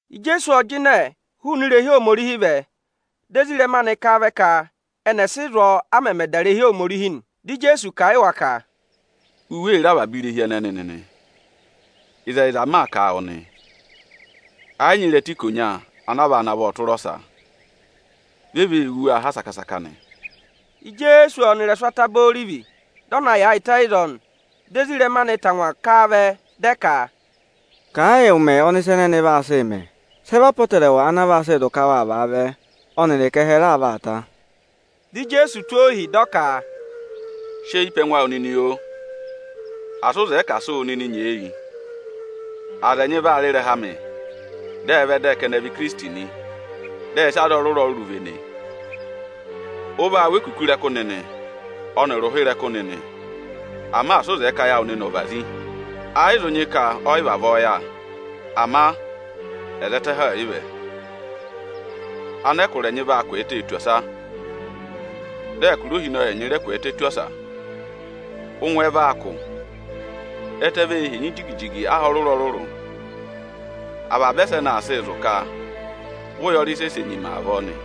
Ijeesu ộ jịnẹ hụụnị irehi Ohomorihi vẹ, dị ezirẹma anị ká a vẹ ka ẹnị ẹ̀ sị zụ̀ ọọ, a mẹmẹ dà irehi Ohomorihi nị. Dị Ijeesu kà a yị wa ka, “U wee re avaba irehi ẹnẹnị nịnị? Ịzẹyịza m maa kà wụ nị, ẹ yị nyị ịrẹta ikonya ana a vaa navọ tụ́ ịrẹsụ ọsa. Vi e vee wú waa ha saka-saka nị.” Ijeesu ộ nọ ịrẹsụ Ataba Orivi, dị ọ na yaayịtẹ ịzọọ nị. Dị ezirẹma anị tangwa ká a vẹ dị ẹ ka, “Kà ẹ yị ụmẹ ọnị ịsa ẹnẹnị vaa sịị mẹ. Sị ẹ vị apọtẹrẹwa ana vaa sị zụ̀ ka waa vaa vaavẹ, ọnịrị ka ẹhẹ raa vaa ta?” Dị Ijeesu tụ́ ohi, dị ọ ka, “Si eyi pe ẹngụ awụ nịnị, oo! Asị ụ zẹẹ ka à sị wụ nịnị nyeeyi! Aza ẹnyị vaa rị ịrẹha amị, dị ẹ vẹ dị ẹ ka ẹnị ẹ vị Ikirisiti nị, dị ẹnịnị vene aza ọrụrụ-ọrụrụ. Ụ vaa wụ́ ekuku ịrẹkụ nịnị ọnịrị ụha ịrẹkụ nịnị, ama asị ụ zẹẹ ka ayị awụ nịnị ọ̀ vazi! Ẹ yị zụ nyị ka ọ yị vavọọ yà, ama ẹzẹtẹ ẹhẹ ọọ̀ yị vẹ. Anẹkụra ẹnyị vaa kwẹẹtẹ tù ọsa, dị ẹkụra ohinọyị ẹnyị rẹ kwẹẹtẹ tù ọsa. Ụngwẹ vaa kụ̀, ẹtẹ vee henyi jigi-jigi aha ọrụrụ-ọrụrụ. Avaba ẹsẹnị aa sịị zụ̀ ka vị ụyọrị sẹsẹ nyima avọọ nị.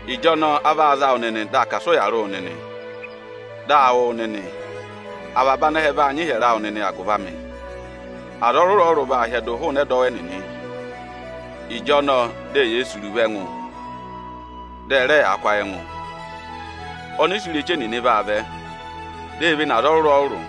Ịjọnọọ a vaa za wụ nịnị dị a ka à sị ụya rị wụ nịnị, dị a wụ wụ nịnị. Avaba anẹhẹ vaa nyị ịhyẹrẹ awụ nịnị agụvị amị. Aza ọrụrụ-ọrụrụ vaa hyẹdụ hụụnị ẹdọwụ ẹnịnị. Ịjọnọọ di eyee sì iruvo ẹngụ, dị ẹ rẹ yaa kụ́ ayị ẹngụ. Ọnịsẹ ireche nịnị vaa vẹ, di e vene aza ọrụrụ-ọrụrụ.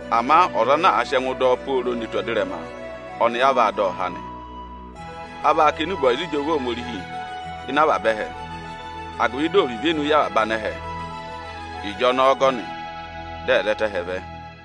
Ama ọza ana àa sị ẹngụ dọ ọ pooro ne tù ẹzẹtẹ, ọnị a vaa dọ ọ há nị. A vaa kà enube ọyịza ịjọva Ohomorihi ịnị avaba ẹhẹ, agụvị dị ọ̀ vị ivenu yị avaba anẹhẹ; ịjọnọọ ọgọnị, dị ẹzẹtẹ ẹhẹ vẹ.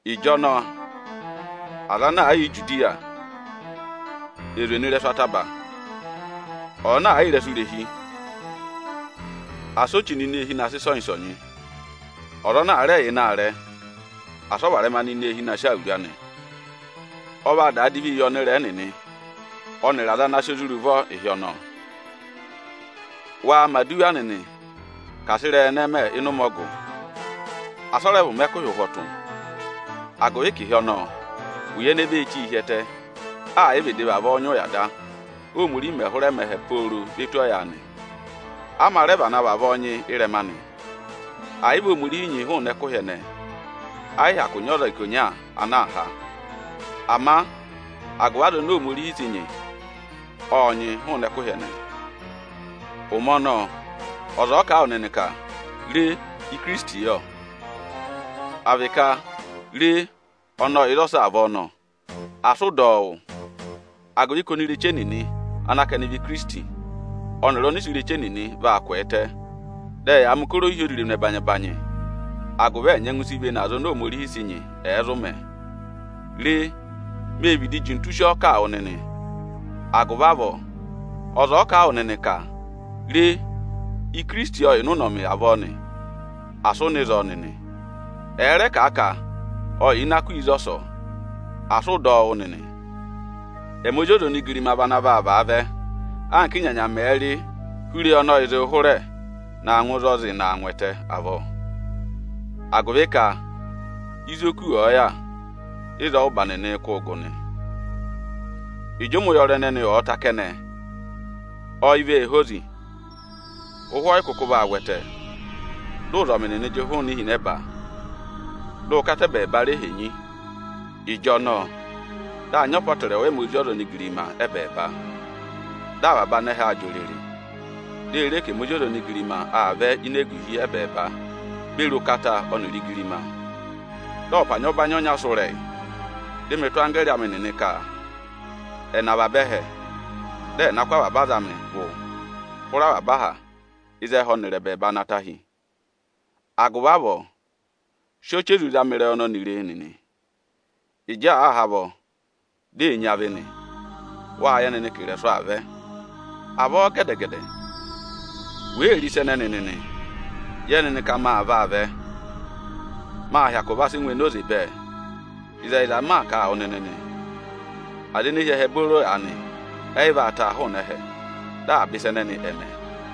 Ịjọnọọ aza ana aa yà Ijudiya, è zwe nọ ịrẹsụ ataba! Ọza ana àa yà ịrẹsụ irehi, asị o chí nọ ini eehi na sị ịsọnyị-ịsọnyị! Ọza ana àa rẹ yà ịnị aarẹ, asị ọ varẹma nọ ini eehi na sị awuru anị! Ọ vaa daa divi yị ọnịrẹẹ nịnị ọnịrị aza ana sị ozi rị ụvọ ịnị ụmẹ ọnọọ. Waa mẹ̀ aduwa nịnị ka asị ịrẹyị ẹnẹẹ mẹ ịnị ụmẹ ọgụ, asị ọ rẹ vị ụmẹ ẹkụhị ụhwọtụ! Agụvị ka ịhị ọnọọ ụya ene vee chí hi ẹtẹ, ẹ̀ yị vịdị vavọọ nyị ụya da, Óhomorihi mẹ̀ hụrẹ mẹ ẹhẹ pooro ve tù ọyaanị. A mā rẹ vana vavọọ nyị ị́rẹma anị. Ẹ̀ yị vị Ohomorihi nyị hụụnị ẹkụhị ẹnẹẹ, ẹ yị hyakụ nyị ọza ikonya ana aa há. Ama agụvị aza oni Ohomorihi sị nyị, ộ nyị hụụnị ẹkụhị ẹnẹẹ. Ụmẹ ọnọọ ọza ọ̀ọ kà a wụ nịnị ka: ‘Re, Ikirisiti yọ!’ à vị ka ‘Re ọnị ọ yà ịzọsọọ avọọ nọ!’—asị ụ dọ ọ wụ́! Agụvị ka onireche nịnị ana ka ẹnị vị ikirisiti, ọnịrị ọnịsẹ ireche nịnị vaa kwẹẹtẹ, dị ẹyaa mẹ̀ ụkọrọ ohyozirenu ẹbanyị-ẹbanyị, agụvị ẹ̀ nyẹngụ si vene aza oni Ohomorihi sị nyị, ẹ̀ẹ zụ mẹ̀ ẹ. Re, mee vịdị jintu sị ọọ kà wụ nịnị! Agụvị avọọ, ọza ọ̀ọ kà a wụ nịnị ka: ‘Re, Ikirisiti ọ yà ịnị ụnọmị avọọ nị’, asị ụ nọ ịzọọ nịnị! Ẹ̀ẹ rẹ kà a ka: ‘Ọ yà ini aku ịzọsọọ’, asị ụ dọ ọ wụ́ nịnị! Ẹmị Ozi ọza onigirima vị ana vaa vaavẹ anka ị́nyanya mẹ̀ẹ̄ rị hụrị eyi ọnị ọyịị̄ zịị hụrẹ na ngụ ịzị ọọ̄ zịị naa ngụ ẹtẹ avọọ. Agụvị ka ịzị oku ọ̀ọ yà, ịzọọ ụ́ba nịnịị̄ kụ́ụ gụ nị.” “Ịjị ụmẹ ụyọrị ẹnẹnị ọ̀ọ ta kẹnẹ, ọyị vee hozi, ụhwẹ ọ yị kụkụ vaa vwẹtẹ, dị ụzọmị nịnị jị hụụnị ihinẹba, dị ụkata ẹbẹẹba re henyi. Ịjọnọọ, dị a nyị apọtẹrẹwa ẹmị Ozi ọza onigirima ẹ́bẹẹba. Dị avaba anẹhẹ aa jị òrèrè, di e re ka ẹmị Ozi ọza onigirima aa vẹ ini eguhi ẹbẹẹba beri ụkata ọnịrị igirima. Dị ọpanyị ọbanyị ọnya sụ́ ịrẹyị, dị mị tụ́ anggẹẹrị amị nịnị ka ẹ̀ nọ avaba ẹhẹ, dị ẹ̀ na kụ́ avaba aza amị gụ hụrẹ avaba aha ịzị ẹhẹ ọnịrị ẹbẹẹba na ta hi. “Agụvị avọọ, sị ọchị ezu zama ịrẹyị ọnọnị re nịnị: Ịjị àa há avọ, di ee nyị avị nị, wâ yẹ nịnị ka ị̀rẹ̀sụ̀ aa vẹ. Avọọ gẹdẹ-gẹdẹ, wèe re ịsa ẹnẹnị nịnị, yẹ nịnị ka maa vaa vẹ, mâ hyakụ va sị ngụ enoze bẹẹ. Ịzẹyịza m maa kà a wụ nịnị nị, aza ene hi ẹhẹ booro aanị, ẹ yị vaa taa hụụnị ẹhẹ, dị avaba ịsa ẹnẹnị ẹ̀ mẹ.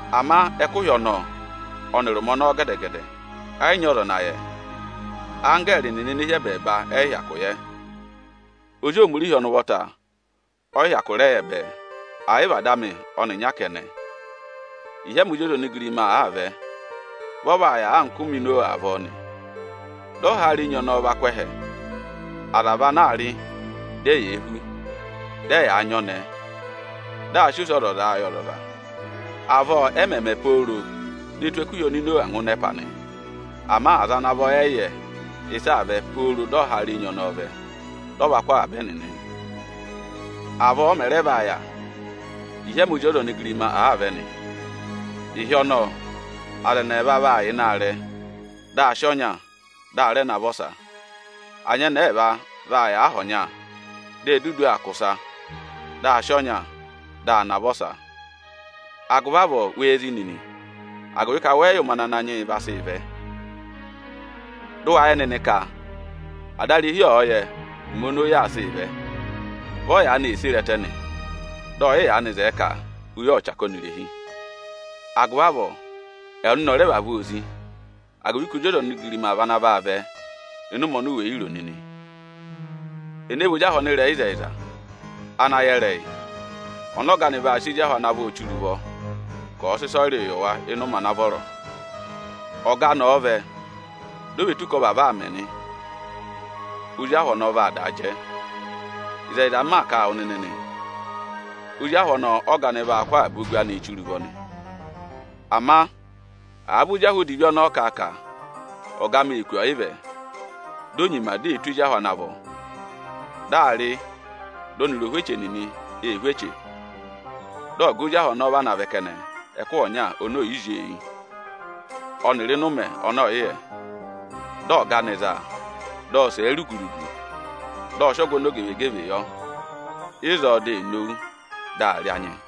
“Ama ẹkụhị ọnọọ ọnịrị ụmẹ ọnọọ gẹdẹ-gẹdẹ ẹ yị nyị ọza ana yẹ. Anggẹẹrị nịnị ene hi ẹbẹẹba ẹ yị hyakụ yẹ, Ozi Ohomorihi ọnị ụvọta ọ yị hyakụ rẹ yẹ bẹẹ, ẹ̀ yị vị Ada amị ọnịnya kẹnẹ. Ịhị ẹmị Ozi ọza onigirima àaa vẹ, vị ọ vaa yà anka ụmẹ Inowa avọọ nị: Dị ọhaara enyi ọnọọ va kụ́ ẹhẹ, aza vị ana aa rị, di eyee hú, dị ẹyaa nyị ọnẹẹ, dị ẹyaa sị ozii gà ọnọrụ. Avọọ ẹ mẹ̀ mẹ pooro ne tù ẹkụhị oni Inowa ngụ ẹpa nị. Ama aza ana vọ ẹ yị yẹ ịsị aa vẹ pooro dị ọhaara enyi ọnọọ vẹ, dị ọ va kụ́ avaba ẹnịnị. Avọọ ọ mẹ̀ rẹ vaa yà, ịhị ẹmị Ozi ọza onigirima àaa vẹ nị. Ịhị ọnọọ aza ẹnị ẹẹva vaa yà ịnị aarẹ, dị a sị ọnya, dị a navọ ọsa. Anyẹnẹẹ ẹẹva vaa yà aha ọnya, di e dudu aa kwọ ịsa, dị a sị ọnya, dị a navọ ọsa. Agụvị avọọ wee zí nịnị, agụvị ka wẹ yị yẹ ụmẹ ana Ananyị yị aa sịị vẹ. Dị ụ wa yẹ nịnị ka adarehi ọ̀ọ yẹ ụmẹ oni oyi vaa sị vẹ, vị ọ yaanị ee sere ẹtẹ nị, dị ọ yị yaanị zẹẹ ka oyi ọ̀ chaka ọnị irehi. Agụvị avọọ ẹwụ nịnị ọ̀ rẹ vavọọ zị́, agụvị ka Ozi ọza onigirima vị ana vaa vẹ ịnị ụmẹ oni wè yi ro nịnị. Ẹnẹ vị ozi ahụ ọnịrẹyịzẹyịza ana yẹ ịrẹyị, ọnị ọga anị vaa sị ezi ahụ ana vọ chire ụvọ ka ọ̀ọ sị ịsọyịrịị yị wa ịnị ụmẹ ana vọrọ? Ọga anị ọ̀ọ vẹ di o ve tù ka ọ vavọọ aa mẹ nị, ozi ahụ ọnọọ vaa daa jẹ. Ịzẹyịza m maa kà a wụ nịnị nị, ozi ahụ ọnọọ ọ́ga anị vaa kụ́ avaba ogu anịị chire ụvọ nị. Ama àa vị ozi ahụ odivi ọnọọ kà a ka: ‘Ọga amị ee kù ọyịvẹ’, di o nyima di ee tụ́ ezi ahụ ana vọ, dị aa rị dị ọnịrị ohweche nịnị ee hú eche nị, dị ọga ozi ahụ ọnọọ vana vẹ kẹnẹ, ẹkụhị ọnya oni ò yi zí ọ eyi, ọnịrị ịnị ụmẹ ọnị ọ̀ yị yẹ. Dị ọga anị za a, dị ọ sẹ̀ ẹ rugu-rugu, dị ọ sị ọgụ ọmọzakụyẹ yọ. Ịzọọ di ee nowu, dị aa rị anyị.”